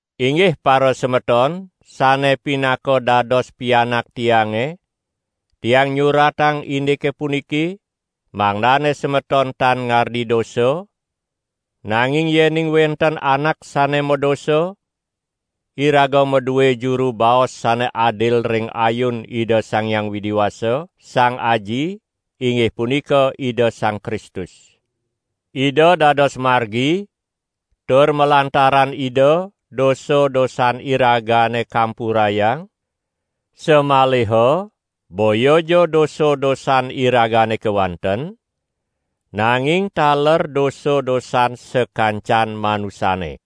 Inggih parasemeton, sane pinaka dados pianak tiange, tiang nyuratang indike puniki, mangdane semeton tan ngardi dosa; nanging yening wenten anak sane madosa, iraga madue juru baos sane adil ring ayun Ida Sang Hyang Widi Wasa, Sang Aji, inggih punika Ida Sang Kristus. Ida dados margi tur malantaran Ida dosa-dosan iragane kampurayang, samaliha boyaja dosa-dosan iragane kewanten, nanging taler dosa-dosan sakancan manusane.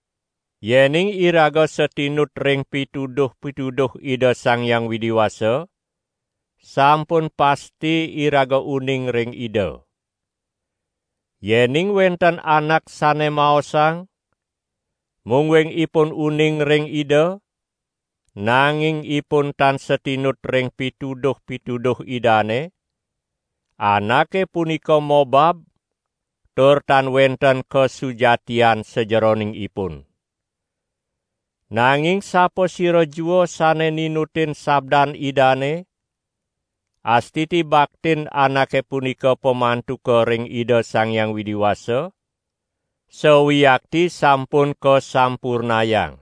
Yening iraga satinut ring pituduh-pituduh Ida Sang Hyang Widi Wasa, sampun pasti iraga uning ring Ida. Yening wenten anak sane maosang, mungguing ipun uning ring Ida, nanging ipun tan satinut ring pituduh-pituduh Idane, anake punika mobab tur tan wenten kasujatian sajeroning ipun. Nanging sapasira jua sane ninutin sabdan Idane, astiti baktin anake punika pamantuka ring Ida Sang Hyang Widi Wasa sawiakti sampun kasampurnayang.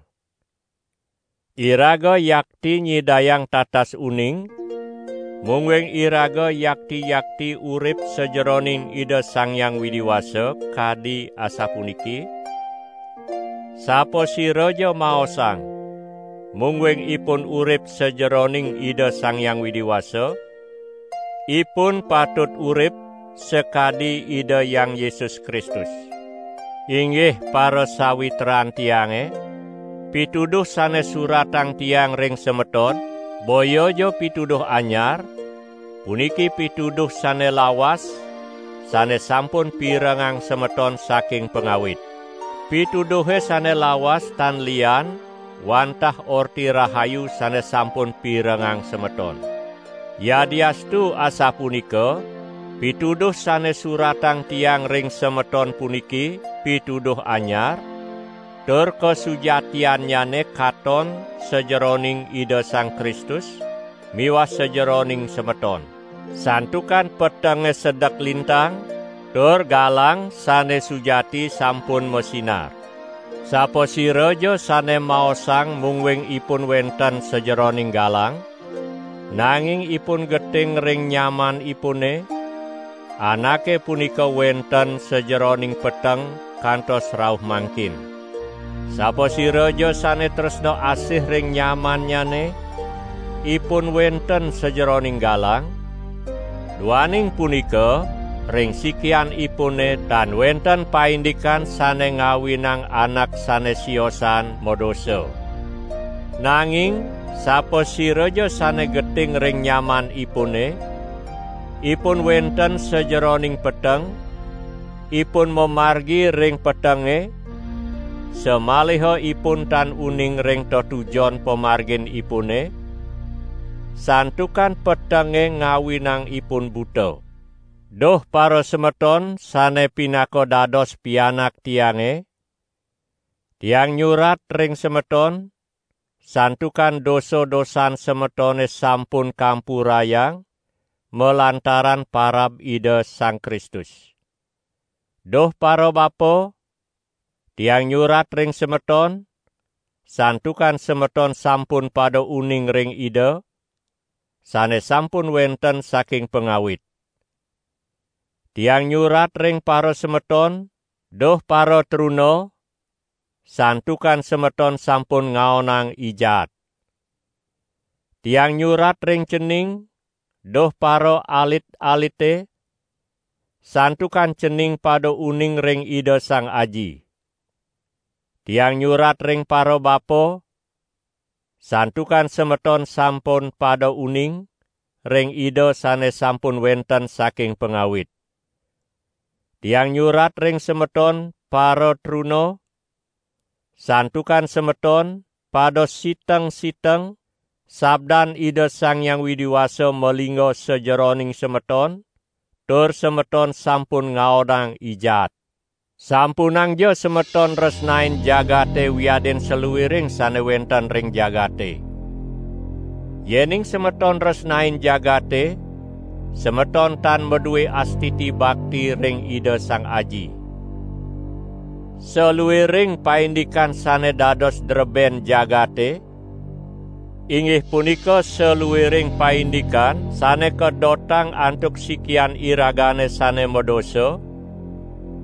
Iraga yakti nyidayang tatas uning mungguing iraga yakti-yakti urip sajeroning Ida Sang Hyang Widi Wasa, kadi asapuniki: "Sapasiraja maosang, mungguing ipun urip sajeroning Ida Sang Hyang Widi Wasa, ipun patut urip sakadi Ida Hyang Yesus Kristus." Inggih parasawitran tiange, pituduh sane suratang tiang ring semeton, boyaja pituduh anyar; puniki pituduh sane lawas, sane sampun pirengang semeton saking pangawit. Pituduhe sane lawas tan lian wantah Orti Rahayu sane sampun pirengang semeton. Yadiastu asapunika, pituduh sane suratang tiang ring semeton puniki pituduh anyar, tur kasujatiannyane katon sajeroning Ida Sang Kristus miwah sajeroning semeton. Santukan petenge sedek lintang tur galang sane sujati sampun masinar. Sapasiraja sane maosang mungguing ipun wenten sajeroning galang, nanging ipun geting ring nyamanipune, anake punika wenten sajeroning peteng kantos rauh mangkin. Sapasiraja sane tresna asih ring nyamannyane, ipun wenten sajeroning galang, duaning punika ring sikianipune tan wenten paindikan sane ngawinang anak sane siosan madosa. Nanging sapasiraja sane geting ring nyamanipune, ipun wenten sajeroning peteng, ipun mamargi ring petenge, samaliha ipun tan uning ring tetujon pamarginipune, santukan petenge ngawinang ipun buta. Duh parasemeton sane pinaka dados pianak tiange, tiang nyurat ring semeton, santukan dosa-dosan semetone sampun kampurayang malantaran parab Ida Sang Kristus. Duh parabapa, tiang nyurat ring semeton, santukan semeton sampun pada uning ring Ida, sane sampun wenten saking pangawit. Tiang nyurat ring parasemeton, duh paratruna, santukan semeton sampun ngaonang I Jaat. Tiang nyurat ring cening, duh paraalit-alite, santukan cening pada uning ring Ida Sang Aji. Tiang nyurat ring parabapa, santukan semeton sampun pada uning ring Ida sane sampun wenten saking pangawit. Tiang nyurat ring semeton, paratruna, santukan semeton, pada siteng-siteng; sabdan Ida Sang Hyang Widi Wasa malingga sajeroning semeton tur semeton sampun ngaonang I Jaat. Sampunangja semeton nresnain jagate wiadin saluiring sane wenten ring jagate. Yening semeton nresnain jagate, semeton tan madue astiti bakti ring Ida Sang Aji. Saluiring paindikan sane dados dreben jagate, inggih punika saluiring paindikan sane kadotang antuk sikian iragane sane madosa,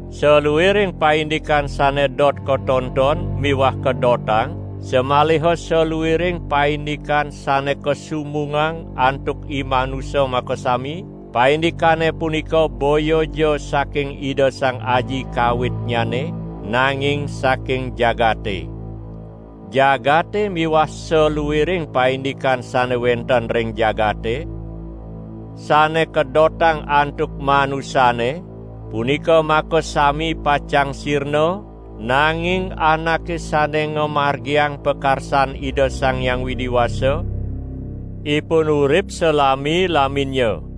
saluiring paindikan sane dot katonton miwah kadotang, samaliha saluiring paindikan sane kasumbungang antuk imanusa makasami, paindikane punika boyaja saking Ida Sang Aji kawitnyane, nanging saking jagate. Jagate miwah saluiring paindikan sane wenten ring jagate, sane kadotang antuk manusane, punika makasami pacang sirna, nanging anake sane ngamargiang pakarsan Ida Sang Hyang Widi Wasa, ipun urip salami-laminnya.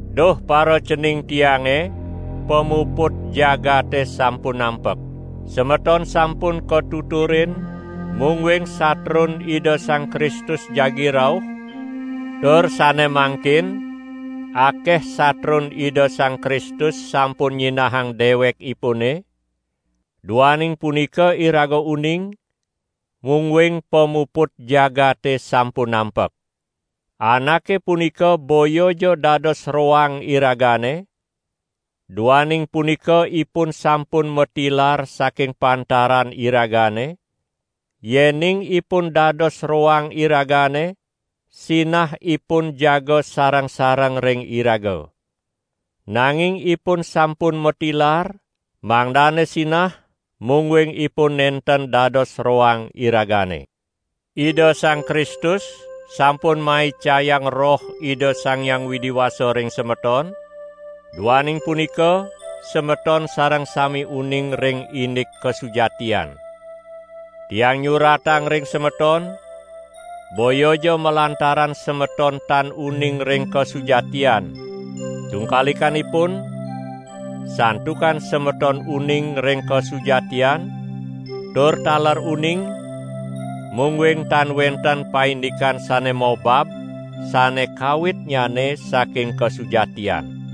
Duh paracening tiange, pamuput jagate sampun nampek! Semeton sampun katuturin, mungguing satrun Ida Sang Kristus jagi rauh; tur sane mangkin akeh satrun Ida Sang Kristus sampun nyinahang dewekipune, duaning punika iraga uning, mungguing pamuput jagate sampun nampek. Anake punika boyaja dados roang iragane, duaning punika ipun sampun matilar saking pantaran iragane; yening ipun dados roang iragane, sinah ipun jaga sareng-sareng ring iraga. Nanging ipun sampun matilar, mangdane sinah, mungguing ipun nenten dados roang iragane. Ida Sang Kristus sampun maicayang Roh Ida Sang Hyang Widi Wasa ring semeton, duaning punika semeton sareng sami uning ring indik kasujatian. Tiang nyuratang ring semeton, boyaja malantaran semeton tan uning ring kasujatian. Tungkalikanipun, santukan semeton uning ring kasujatian, tur taler uning, mungguing tan wenten paindikan sane mobab sane kawitnyane saking kasujatian.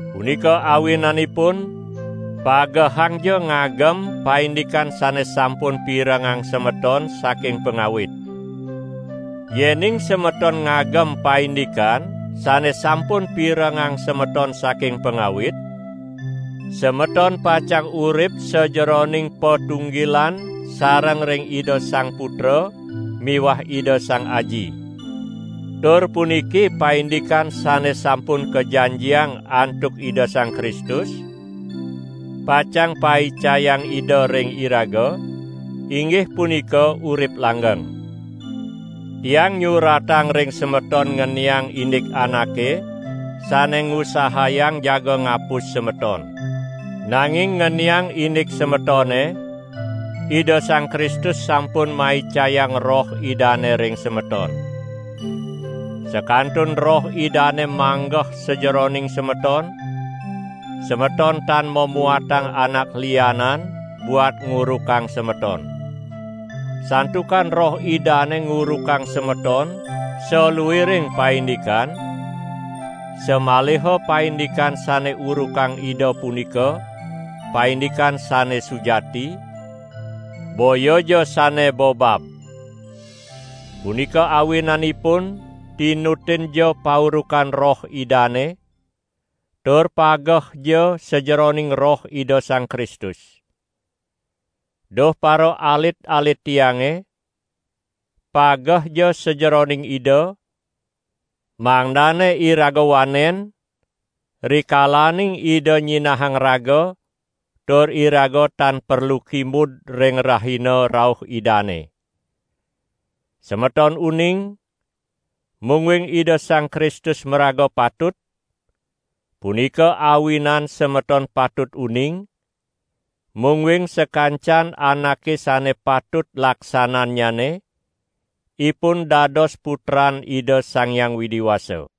Punika awinanipun, pagehangja ngagem paindikan sane sampun pirengang semeton saking pangawit. Yening semeton ngagem paindikan sane sampun pirengang semeton saking pangawit, semeton pacang urip sajeroning patunggilan sareng ring Ida Sang Putra miwah Ida Sang Aji. Tur puniki paindikan sane sampun kajanjiang antuk Ida Sang Kristus, pacang paicayang Ida ring iraga, inggih punika urip langgeng. Tiang nyuratang ring semeton ngeniang indik anake sane ngusahayang jaga ngapus semeton. Nanging ngeniang indik semetone, Ida Sang Kristus sampun maicayang Roh Idane ring semeton. Sakantun Roh Idane manggeh sajeroning semeton, semeton tan mamuatang anak lianan buat ngurukang semeton. Santukan Roh Idane ngurukang semeton saluiring paindikan, samaliha paindikan sane urukang Ida punika paindikan sane sujati, boyaja sane bobab. Punika awinanipun tinutinja paurukan Roh Idane, tur pagehja sajeroning Roh Ida Sang Kristus. Duh paraalit-alit tiange, pagehja sajeroning Ida, mangdane iraga wanen, rikalaning Ida nyinahang raga tur iraga tan perlu kimud ring rahina rauh Idane. Semeton uning, mungguing Ida Sang Kristus maraga patut; punika awinan semeton patut uning, mungguing sakancan anake sane patut laksanannyane, ipun dados putran Ida Sang Hyang Widi Wasa.